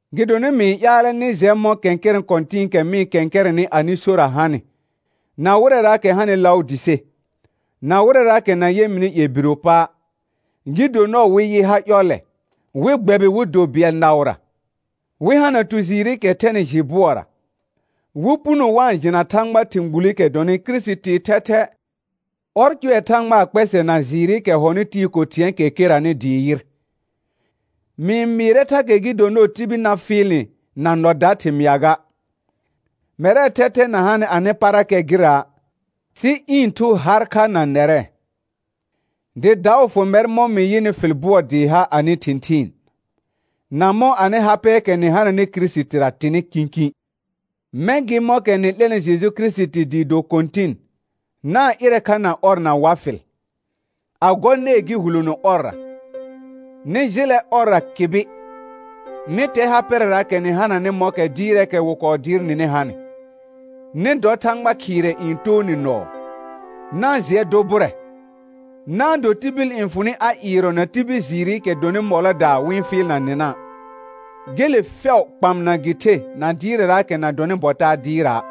Gɩdonɩ mɩ-n ƴaalɛ nɩ jɛ mɔ̃ kɛ̃kɛrɛ̃ kɔ̃tɩ̃ɩkɛ mɩ-n kɛ̃kɛrɛnɩ anɩ sora hanɩ, na wɩrɛraakɛ hanɩ Laʋdɩse, na wɩrɛraakɛ na yɛ mɩnɩ ƴɛbiro pa', gɩ do nɔɔ wɩ yɩ ha ƴɔllɛ, wɩ gbɛbɩ wɩ do bɩɛl naʋra, wɩ hana tu jɩɩrɩkɛ thɛnɩ jɩ bʋɔra, wɩ puno wa-n jɩna Thãgbaa thɩ̃ gbulikɛ dɔnɩ Kirisitii thɛthɛ. Ɔr cʋɛ Thãgbaa kpɛsɛ na jɩɩrɩkɛ hɔnɩ tɩɩ ko thɩ̃ɛɛkɛ keranɩ dɩɩ yɩr. Mɩ-n mɩɩrɛ thakɛ gɩ do nɔɔ tibil na fɩɩl nɩ na nɔ da thɩmɩa ga. Mɛrɛɛ thɛthɛ na hanɩ anɩ parakɛ gɩra', sɩ ɩ̃ thu har kha na nɛrɛ, dɩ daʋ fʋ mɛr mɔ̃ mɩ yɩnɩ fɩl bʋɔ dɩɩ ha anɩ thɩ̃thɩɩn, na mɔ̃ anɩ ha pɛɛkɛ nɩ hananɩ Kirisitira tɩnɩ kĩkĩ. Mɛ̃ gɩ mɔ̃kɛ nɩ 'lɛnɩ Jeju Kirisiti dɩ do Kɔ̃tɩn, na-n ɩrɛ kha na ɔr na wa fɩl, a gɔ nɛɛ gɩ hulono ɔrra; nɩ jɩlɛ ɔrra kɩbɩ, nɩ tɛ ha pɛrɛraakɛ nɩ hananɩ mɔ̃kɛ dɩɩrɛɛkɛ wɩ kɔɔ dɩɩr nɩnɩ hanɩ. Nɩ dɔ Thãgba khɩɩrɛ n too nɩ nɔɔ. Na-n jɩɛ dʋ bʋrɛ, na-n do tibil n fʋ nɩ a ɩɩrɔ na tibil jɩɩrɩkɛ dɔnɩ mɔlɔdaa wɩ-n fɩɩlna nɩna', gele fɛʋ kpamna gɩ the na dɩɩrɛraakɛ na dɔnɩ bɔ taa dɩɩra',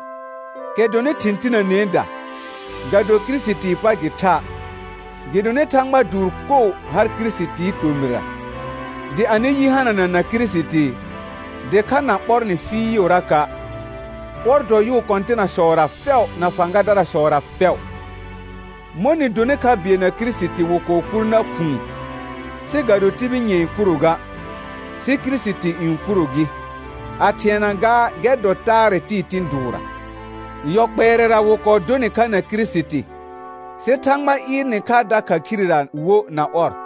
kɛ dɔnɩ thɩ̃ tinəneeda, ga do Kirisitii pa gɩ tha'. Gɩdonɩ Thãgba dʋʋr koo har Kirisitii tomɩra. Dɩ anɩ yi hanana na Kirisiti, dɩkha na ɓɔr nɩ fɩɩʋraka'. Ɔr dɔ yʋʋ kɔ̃tɩnasɔra fɛʋ na fãgadarasɔra fɛʋ. Mɔ̃ nɩ donɩ kha bɩɛl na Kirisiti wɩ kɔɔ kur nar khʋ̃ʋ, sɩ ga do tibil nyɛ̃ɛ kuro ga, sɩ Kirisiti n kuro gɩ; a thɩɛna gaa gɛr dɔ taarɛ tɩɩ tɩ̃ dʋʋrra. Yɔ kpɛɛrɛra wɩ kɔɔ dʋ nɩ kha na Kirisiti, sɩ Thãgba ɩɩr nɩ kha dakha khirera wo na ɔrra,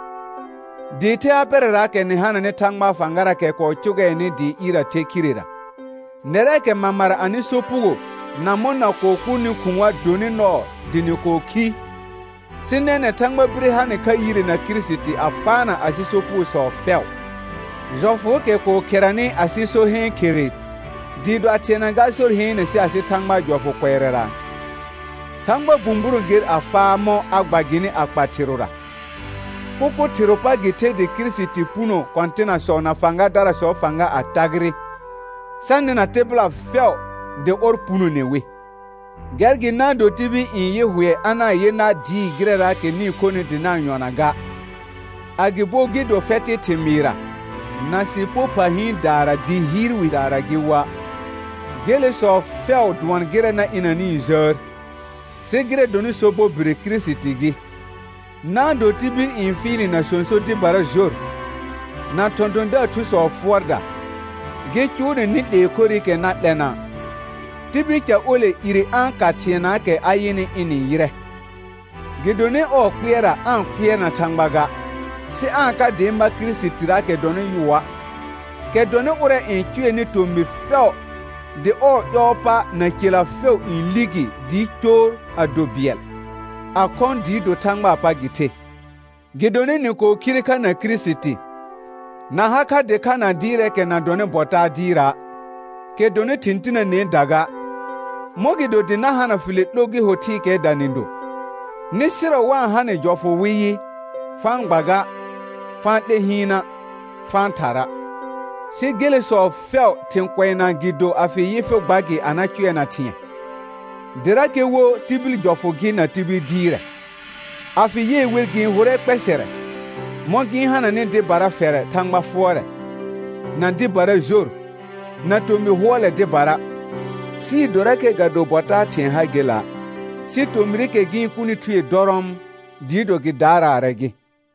dɩɩ the ha pɛrɛraakɛ nɩ hananɩ Thãgbaa fãgaraakɛ kɔɔ cʋgɛɛnɩ dɩ ɩɩr a the khirera. Nɛrɛɛkɛ mamara anɩ sopugo na mɔ̃ na kɔɔ kurni khʋ̃a' dɔnɩ nɔɔ dɩ nɩ kɔɔ khi, sɩ nɛnɛ̃ Thãgba bire ha nɩ kha yire na Kirisiti a faana asɩ sopugosɔ fɛʋ. Jɔfʋʋkɛ kɔɔ kheranɩ asɩ so heen khere dɩɩ do a thɩɛna gaa sor heene sɩ asɩ Thãgbaa jɔfʋ kʋɛrara, Thãgba bũburõ ger a faa mɔ̃ a gba gɩnɩ a kpa thɩrʋra. Kʋkʋ thɩrʋʋ pa gɩ the dɩ Kirisiti puno kɔ̃tɩnasɔ na fãgadarasɔɔ fãga a tagɩrɩ, sa nɩna tɩbɩla fɛʋ dɩ ɔr punone wi. Gɛr gɩ na-n do tibil n yɩ hʋɛ a na-n yɩ nar dɩɩ gɩrɛraakɛ nɩ-n khonɩ dɩ na-n yɔna ga, agɩbo gɩ do fɛtɩ thɩmɩɩrra, na sɩpo pha hɩɩndaara dɩ hɩɩr widaara gɩ woa'. Gelesɔ fɛʋ dʋɔn gɩrɛ na ɩnanɩɩ jəər, sɩ gɩrɛ dɔnɩ sobɔ bire Kirisiti gɩ. Na-n do tibil n fɩɩl nɩ na sõso dɩbara jor, na thɔ̃thɔ̃daar thusɔɔ fʋɔrda, gɩ cʋʋ nɩ nɩ 'lee khorɩkɛ na 'lɛna'. Tibil ca ole ire a-n ka thɩɛnaakɛ a yɩnɩ ɩnɩ yɩrɛ, gɩdonɩ ɔɔ kpɩɛrra aa-n kpɩɛrna Thãgba ga; sɩ aa-n ka dɩ ma Kirisitiraakɛ dɔnɩ yʋa', kɛ dɔnɩ ʋrɛ n cʋɛnɩ tomɩr fɛʋ dɩ ɔɔ ƴɔɔ pa na cela fɛʋ n li gi dɩɩ coor a do bɩɛl, a khɔ̃ dɩɩ do Thãgbaa pa gɩ the. Gɩdonɩ nɩ kɔɔ khire kha na Kirisiti, na ha kha dɩkha na dɩɩrɛɛkɛ na dɔnɩ bɔ taa dɩɩra', kɛ dɔnɩ thɩ̃ tinəneeda ga, mɔ̃gɩdo dɩ na hana fɩlɛ 'lo gɩ ho thɩɩkɛɛda nɩ do, nɩ sɩrɔ wa-n ha nɩ jɔfʋ wɩ yɩ: Fa-n gba ga, fa-n 'lɛ hɩɩna', fa-n thara'. Sɩ gelesɔ fɛʋ thɩ̃ kʋɛna gɩ do a fɩ yɩ fɩ gba gɩ a na cʋɛna thɩ̃ɛ, dɩrakɛ wo tibil jɔfʋ gɩ na tibil dɩɩrɛ. A fɩ yɩɛ wer gɩ-n hʋrɛ kpɛsɛrɛ, mɔ̃ gɩ-n hananɩ dɩbara fɛrɛ Thãgba fʋɔrɛ, na dɩbara jor, na tomɩ hʋɔlɛ dɩbara, sɩɩ dorakɛ ga do bɔ taa thɩ̃ɛ ha gela', sɩ tomɩrɩkɛ gɩ-n kʋnɩ thue dɔrɔɔm, dɩɩ do gɩ daaraarɛ gɩ.